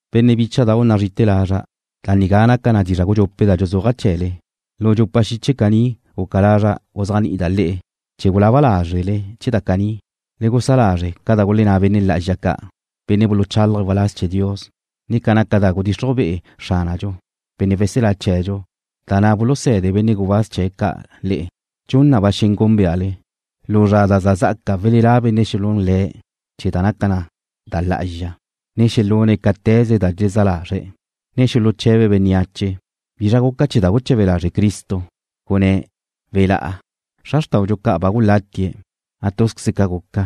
Benne' bícha'dau' nazri'ite̱ lazra', da nigá naca na dizra' gudxupe' da dxuzúaja' chee̱le. Lu dxúpate̱ xiche caní guca lazra' guzéajni'ida' le'e chee̱ gulaba lázrele chee̱ da caní. Le gusá lazre' ca da gulenná benne' lá'azxa ca', benne' buluchálaje' waláz chee̱ Dios, ne ca naca da gudixruj be'e Xránadxu, Benne' Weselá chee̱dxu, da na' buluse̱de benne' gubáz chee̱' ca' le'e. Dxunna ba xen gúnbeale, lu zra da za zá'aca welelá' benne' xelún le̱' chee̱ da zaj naca na da lá'azxa, ne xelune̱' cáte̱ze da dxelezá lazre̱', ne xuluche̱be̱' bénneache: ¿Bizra guca chee̱ da guche̱be lazre' Cristo, gunné̱': Welá'a? Xra xrtáudxu ca' ba gulatie̱', na' túzqueze ca guca,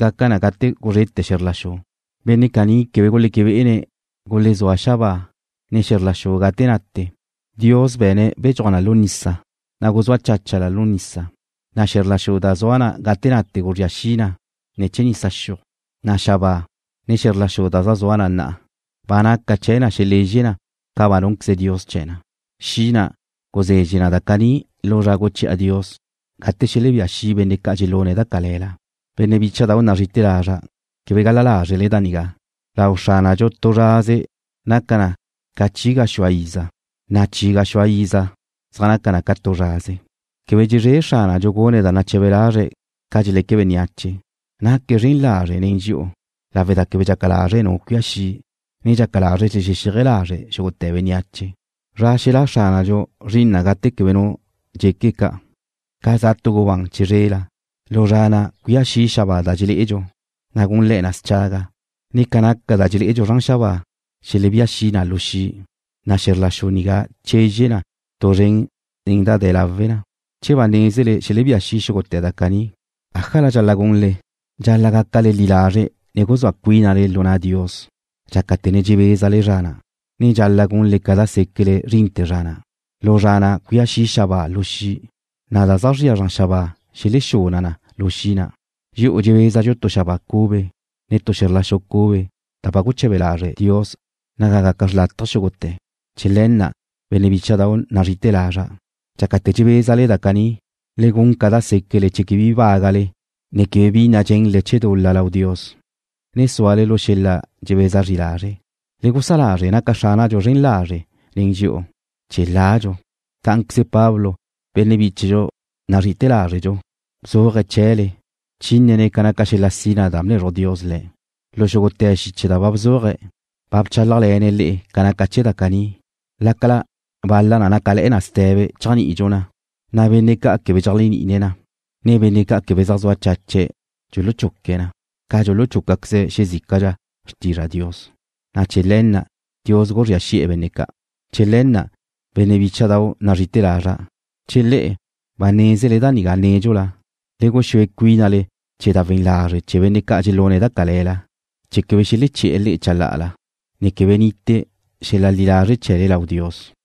gaca na gate guzrete̱ xe̱zr la xu. Benne' caní quebe dxeleque be'ene̱' gulezúa xabáa, ne xe̱zr la xu gate nate, Dios gunné̱' bedxúaj na lu nisa, na' guzúa chacha na lu nisa, na' xe̱zr la xu da zua gate nate guzría xi na ne̱ chee̱ nisa xiuj, na' xabáa, ne xe̱zr la xu da zaj zua na na'a, ba naca chee̱ na xelezxe na ca ba núnqueze Dios chee̱ na. Xi' na' guzezxe na da caní lu zra guchi'a Dios, gate xelebía xi' benne' ca' dxelune̱' da cale̱la. Benne' bícha'dau' nazri'ite̱ lazra', quebe gal-la lázrele da nigá: Lau Xránadxu tu zraze naca na ca chi gaxúa iza, na' chi gaxúa iza zaj naca na ca tu zraze. Quebe dxezré Xránadxu gune̱' da nache̱be lazre̱' ca dxeleque bénneache. Naque̱' zren lazre' nen dxi'u lawe' da quebe dxaca lazre̱' nu cuía xi'. Dxaca lazre̱' xelexexíaje lazre' xúgute̱ bénneache. Zra xelá' Xránadxu zrin na gate quebe nu dxeque ca', ca za' tu gubán chizrela. Lu zra na' cuía xi' xabáa da dxelé'edxu, na' gunle̱'e̱ na schaga, ne ca naca da dxelé'edxu zran xabáa xelebía xi na lu xi', na' xe̱zr la xu nigá chezxe na tu zren nen da de̱ lawe na. Che ba nézele xelebía xi' xúgute̱ da caní, ¿ájala dxal-la' gunle? Dxal-la' gácale li lazre' ne guzúa cuínale lu na' Dios dxácate̱ ne dxebézale zra na', ne dxal-la' gunle ca da séquele zrinte̱ zra na'. Lu zra na' cuia xi' xabáa lu xi', na' da zaj zria zran xabáa xelexuna na lu xi' na'. Dxi'u dxebézadxu tu xabáa cube, ne tu xe̱zr la xu cube da ba guche̱be lazre' Dios naga gaca xlátaje̱ xúgute̱. Chee̱ le̱ na', benne' bícha'dau' nazri'ite̱ lazra', dxácate̱ dxebézale da caní, le gun ca da séquele chee̱ quebe bi bágale, ne quebe bi nadxenle chee̱ dul-la lau Dios, ne suale lu xel-la' dxebeza zri lazre'. Le gusá lázrele naca Xránadxu zren lazre' nen dxi'u chee̱ ladxu. Cá'anqueze Pablo, benne' bíchedxu nazri'ite̱ lázredxu, bzuaje̱' chee̱le, bchínene̱' ca naca xel-la' sina da bnezruj Dios le̱'. Lu xúgute̱ xiche da ba bzuaje̱', ba bchálajle̱ne̱' le'e ca naca chee̱ da caní, lácala bal-la na nácale̱'e̱ na ste̱be chéajni'idxu na, na' benne' ca' quebe dxeléajni'ine̱' na, ne benne' ca' quebe zaj zua chache̱' dxuluchuque̱' na, ca dxuluchuque̱' xezícala xrtizra Dios, na' chee̱ le̱ na' Dios guzría xi'e̱ benne' ca'. Chee̱ le̱ na', benne' bícha'dau' nazri'ite̱ lazra', che le'e ba nézele da nigá nédxula, le guxúe cuínale chee̱ da we̱n lazre' chee̱ benne' ca' dxelune̱' da cale̱la chee̱ quebe xeleché̱ le'e chalá'ala, ne quebe nite xel-la' li lazre' chee̱le lau Dios.